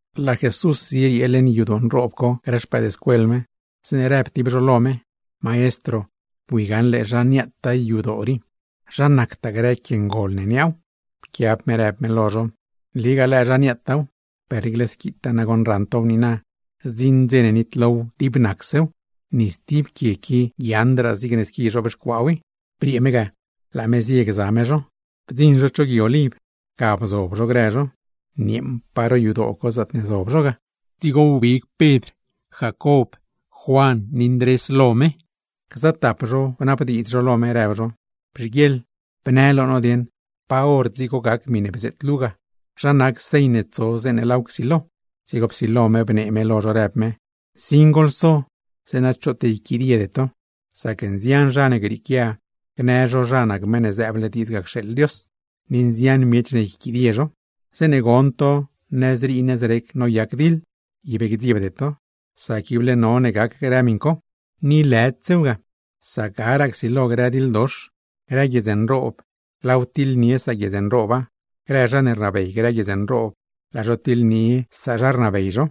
Laa Jesús zieriee leṉ yadoo nroob co grë xpëëdscuel me, zeeṉe rëb tib zho lo me: ―Maestro, ¡bui gaṉle zha niaataa yadoo rii! ¡Zha rnataa grë quie ngol ne niaaw! Pquiab me rëb me lo zho: ―Nligaa lëë zha niaataaw. Per niicle squitaa goṉ raṉ tow niina, zdziṉ dze ne nitlow dib nacsew. Ni stib quie qui guiaaṉdraa zigne squi zhobxcuaaw i. Briee me ga, laa me zie gza me zho. Bdziṉ zho cho Gui Oliv, ga bzob zho grë zho. Nieeṉpaa ro yadoo co zaatne zob zho ga; dzigo wbig Pedr, Jacob, Juan ni Ndrés lo me, gza tap zho bnabdiidz lo me rëb zho: ―Bzhiguieḻ bnë lo no dieṉ, ¿pa hor dzigo gac miṉe bzeet luu ga? ¿Zha nac señ ne tso zeeṉe laaw csilo gac? Dzigo psilo me bnee me lo zho, rëb me: ―Nsin goḻso zeeṉa choot yquidiede to. Sac nzian zha ne grieequia gnë zho zha nac Meṉ ne zëëble diidz cxeeḻ Dios; ni nzian miech ne yquidie zho. ’Zeeṉe gon to nëzrii nëzrec noyac diḻ, ib gdziebde to; sac ible none gac grë miṉ co, ni lëdsew ga. Sac garaa csilo grë diḻdox, grë guiedz nroob laaw tiḻnie saguiedz nrooba; grë zha ne rnabey grë guiedz nroob, laa zho tiḻnie sazha rnabey zho.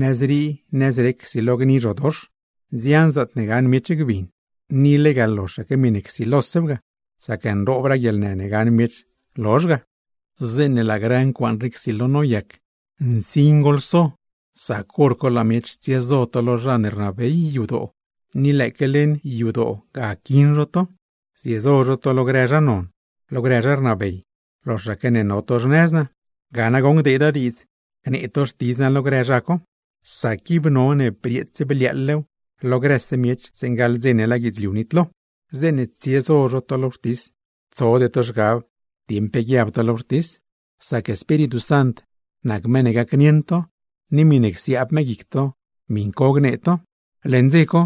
Nëzrii nëzrec csilo gni grë zhodox, nzian zaatne gaṉ miech gbin. Ni lega loxaque miṉe rsilosew ga, sac nroobraa guieḻnë ne gaṉ miech lozh ga. ’Zeeṉe laa grë ncuaaṉ rii rsilo noyac, ¡nsin goḻso! Sac hor co laa miech tsiezo to lo zha ne rnabey yadoo, ni lëëque leṉ yadoo ga quiṉ zho to; ziezo zho to lo grë zha non, lo grë zha rnabey, loxaque ne no to xnëz naa. Ga nagoṉ gdeeda diidz gnee to Xtidz naa lo grë zha co, sac ib none brieets bliaaḻlew lo grëse miech zeeṉe gaḻ dze ne laa guidzliu nitlo. Zeeṉe tsiezo zho to lo wxtis, tsode to zhgab dieṉ pe guiab to lo wxtis; sac Espíritu Sant nac meṉ ne gacnieṉ to, ni miṉe csiaab me guic to miṉ co gnee to. ’Leṉ dze co,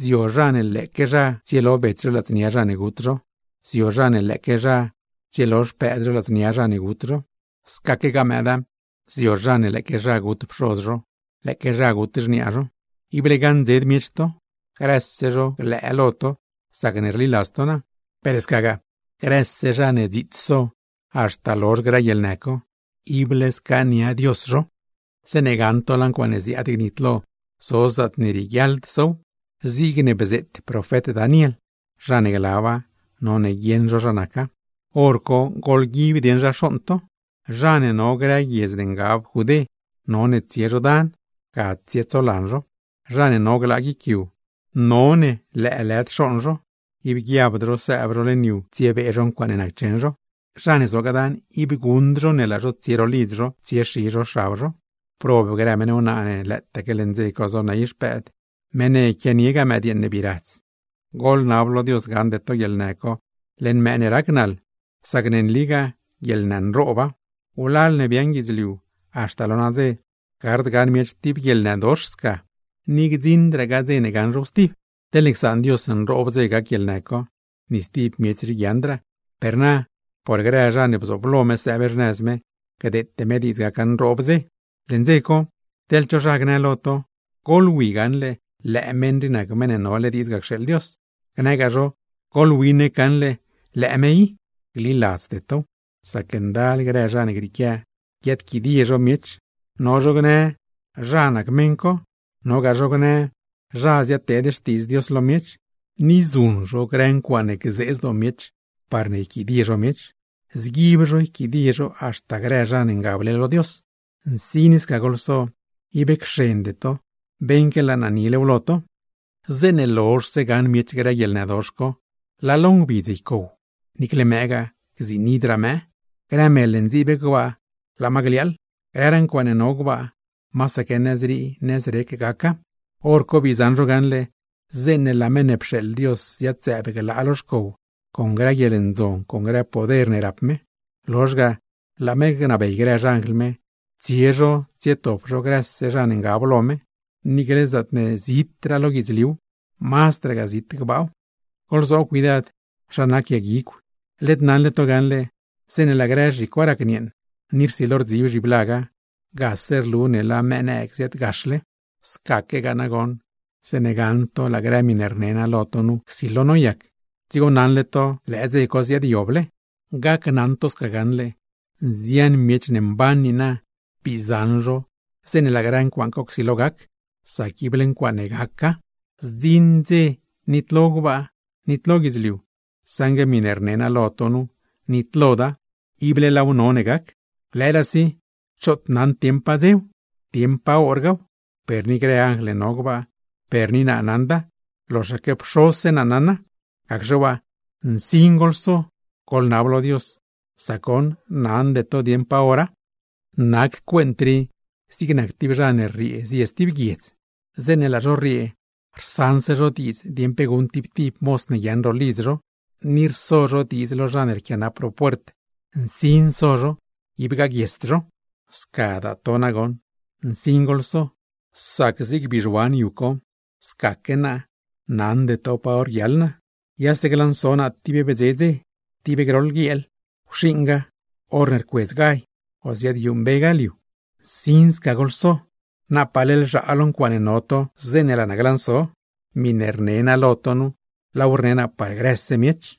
zio zha ne lëëque zha tsielo bets zho ladznia zha ne gut zho; zio zha ne lëëque zha tsielo xpëëd zho ladznia zha ne gut zho; scaquegaa mëëda, zio zha ne lëëque zha gut pxoz zho, lëëque zha gut xniaa zho. Ible gaṉdzed miech to, grëse zho glëë lo to sacne rliladz to naa; per scagaa, grëse zha ne dziits so haxta lozh grë guieḻnë co, ible scaania Dios zho. ’Zeeṉe gaṉ to laa ncuaaṉe ziaad gnitlo zo zaatne rieguiaḻd sow, zigne bzeet profet Daniel (zha ne glaba, none guieṉ zho zha naca), hor co goḻguib dieṉ zha xooṉ to. Zha ne no grëraa guiedz ne ngab Judé, none tsie zho dan, ga tsietsolan zho. Zha ne no glaa guic yu, none lëëlëd xooṉ zho, ib guiabd zho sëëb zho leṉ yu tsiebee zho ncuaaṉe naccheṉ zho. Zha ne zogaa dana, ib guṉd zho ne laa zho tsie ro lidz zho tsiexi zho xab zho. ¡Prob grë meṉ wnaa ne lëëtaque leṉ dze co zoney xpëëd, meṉ ne quianiegaa mëdyeeṉ ne bii radz! Goḻnab lo Dios gaṉde to guieḻnë co leṉ mëë ne rac naḻ, sac ne nligaa guieḻnë nrooba. Wlal ne biaaṉ guidzliu haxta lo nadze, gard gaṉ miech tib guieḻnëdox sca, ni gdziṉdragaa dze ne gaṉ zhow stib. Teḻne csaan Dios nroob dze gac guieḻnë co, ni stib miech rii guiaaṉdraa; per na por grë zha ne bzooblo me sëëb xnëz me, gdeete me diidz gaca nroob dze. ’Leṉ dze co, teḻ cho zha gnë lo to: “Goḻwi gaṉle, lëë meṉ rii nac Meṉ ne nole diidz ga cxeeḻ Dios”, gnëgaa zho: “Goḻwi nec gaṉle, lëë me i”, gliladzde tow. Sac ndal grë zha ne grieequia guiaadquidie miech, no zho gnë zha nac meṉ co, nogaa zho gnë zha ziadteed Xtiidz Dios lo miech; ni zuṉ zho grë milagr parne yquidie zho miech, parne yquidie zho haxta grë zha ne ngable lo Dios. ¡Nsin sca goḻso! Ib cxende to, beṉque laa naa nilew lo to. ’Zeeṉe lozhse gaṉ miech grë guieḻnëdox co, laa lo ngbidz ycow, gziinidraa mëë. Grë mel ne ndziib gbaa, laa ma gliaaḻ; grëraa ncuaaṉe no gbaa, masaque nëzrii nëzrec gaca. Horco bii zaṉ zho gaṉle, zeeṉe laa Meṉ ne pxeeḻ Dios ziad-zëëb glaa lo xcow con grë guieḻndzon con grë poder ne rap me. Lozh ga laa me gnabey grë xanjl me, tsie zho tsietop zho grëse zha ne ngab lo me, niicle zaatne mazdraa zit lo guidzliuw, mazdragaa zit gbaaw. ’Goḻzoob cuidad zha nac yag guigw. Led naṉle to gaṉle, zeeṉe laa grë zhicwa racnieeṉ, ni rsilo rdzib zhiblaga, gase rlu ne laa mëë nëëg ziaadgaxle. Scaquegaa nagoṉ, zeeṉe gaṉ to laa grë miṉe rne naa lo to nu rsilo noyac, dzigo naṉle to lëë dze co ziaadyoble. Gneli naa lo to gaṉle, nzian miech ne mban niina bii zaṉ zho zeeṉe laa grë ncuaaṉ co csilo gac; sac ible ncuaaṉe gaca. Zdziṉ dze nitlo gbaa, nitlo guidzliu, saṉgue miṉe rne naa lo to nu, nitloda, ible laaw none gac. Lëëraasi choot naṉd dieṉ pa dzew, dieṉ pa horgaaw, per ni grë anjl ne no gbaa, per ni naa naṉda; loxaque Pxozse naa naṉa. Gacxe waa, nsin goḻso, goḻnab lo Dios; sac goṉ naṉde to dieṉ pa hora. ’Nac cuent rii zig nac tib zha ne rriee zie tib guiedz zit. Zeeṉe laa zho rriee, rsaṉse zho diidz dieṉ pe guṉ tib tib moz ne guiaaṉ ro lidz zho, ni rso zho diidz lo zha ne rquianap ro puert nsin so zho, ib gaguiesd zho. Scadaa to nagoṉ nsin goḻso, sac zig bizhuan yu co scaquegaa naa naṉde to pa hor guiaḻ naa, yase glanso naa tib bdze dze, tib groḻ guieel, wxiṉgaa horne rcuedz gall, o ziaadyuṉmbegaa liu. Nsin goḻso, zeeṉa iṉe zobna to zeeṉe laa naa glanso. Miṉe rne naa lo to nu, laaw rne naa par grëse miech.